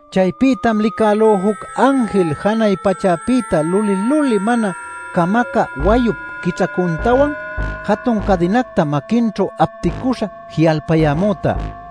Chaypïtam licälú juc anjil janay pachäpïta luli-luli mana camacä wayup quićhacuntawan jatun cadinacta maquinćhu apticüśha ji'alpayämüta.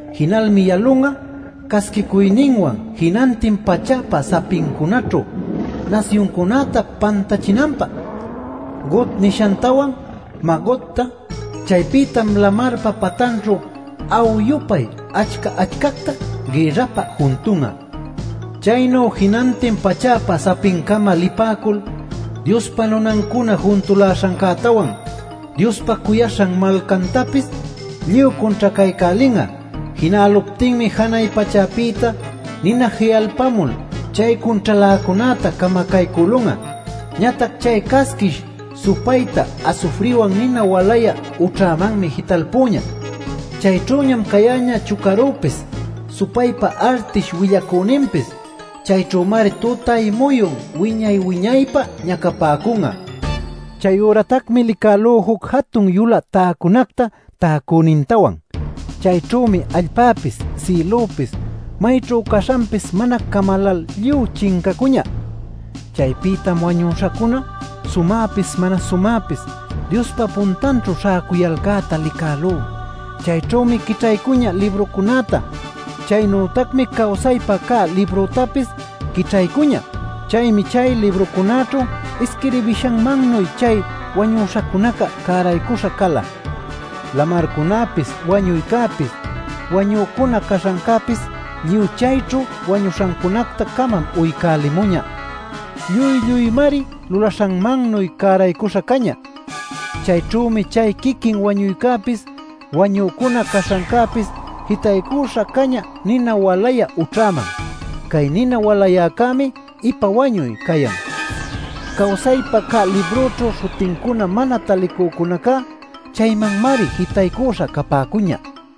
Jinalmi yalun'a casquicuyninwan jinantin pachäpa sapincunaćhu nasyuncunäta pantachinanpä, Gog nishantawan Magogta. Chaypïtam lamarpa patanćhu a'u-yupay achca-achcacta gïrrapä juntun'a. Chaynu jinantin pachäpa sapincama lipäcul, Diospa nunancuna juntuläśhancätawan Diospa cuyaśhan malcantapis lluy cunćhacaycälin'a. Jinäluptinmi janay pachäpïta nina ji'alpamul chay cunćhaläcunäta camacaycülun'a. Ñatac chay casquish supayta asufriwan nina walayä ućhamanmi jitalpüñä. Chayćhüñam cayäñä chucarüpis, supaypa artish willacüninpis. Chayćhümari tutay-muyun wiña-wiñaypä ñacapäcun'a. Chayüratacmi licälú juc jatun yulä täcunacta täcünintawan. Chayćhümi allpäpis, sïlüpis mayćhu caśhanpis mana camalal lluy chincacuñä. Chaypïtam wañüśhacuna sumäpis mana sumäpis Diospa puntanćhu śhäcuyalcäta licälú. Chayćhümi quićhaycuñä librucunäta. Chaynütacmi cawsaypä cä libructapis quićhaycuñä. Chaymi chay librucunäćhu isquirbishanmannuy chay wañuśhacunaca cäraycuśha cala. Lamarcunäpis, wañuycäpis, wañücuna caśhancäpis lluy chayćhu wañuśhancunacta-camam uycälimuñä. Lluy-lluymari lulaśhanmannuy cäraycuśha cañä. Chayćhümi chay quiquin wañuycäpis, wañücuna caśhancäpis jitaycuśha cañä nina walayä ućhaman. Cay nina walayäcämi “ipa wañuy” cayan. Cawsaypä cä librućhu śhutincuna mana talicücunacá chaymanmari jitaycuśha capäcuñä.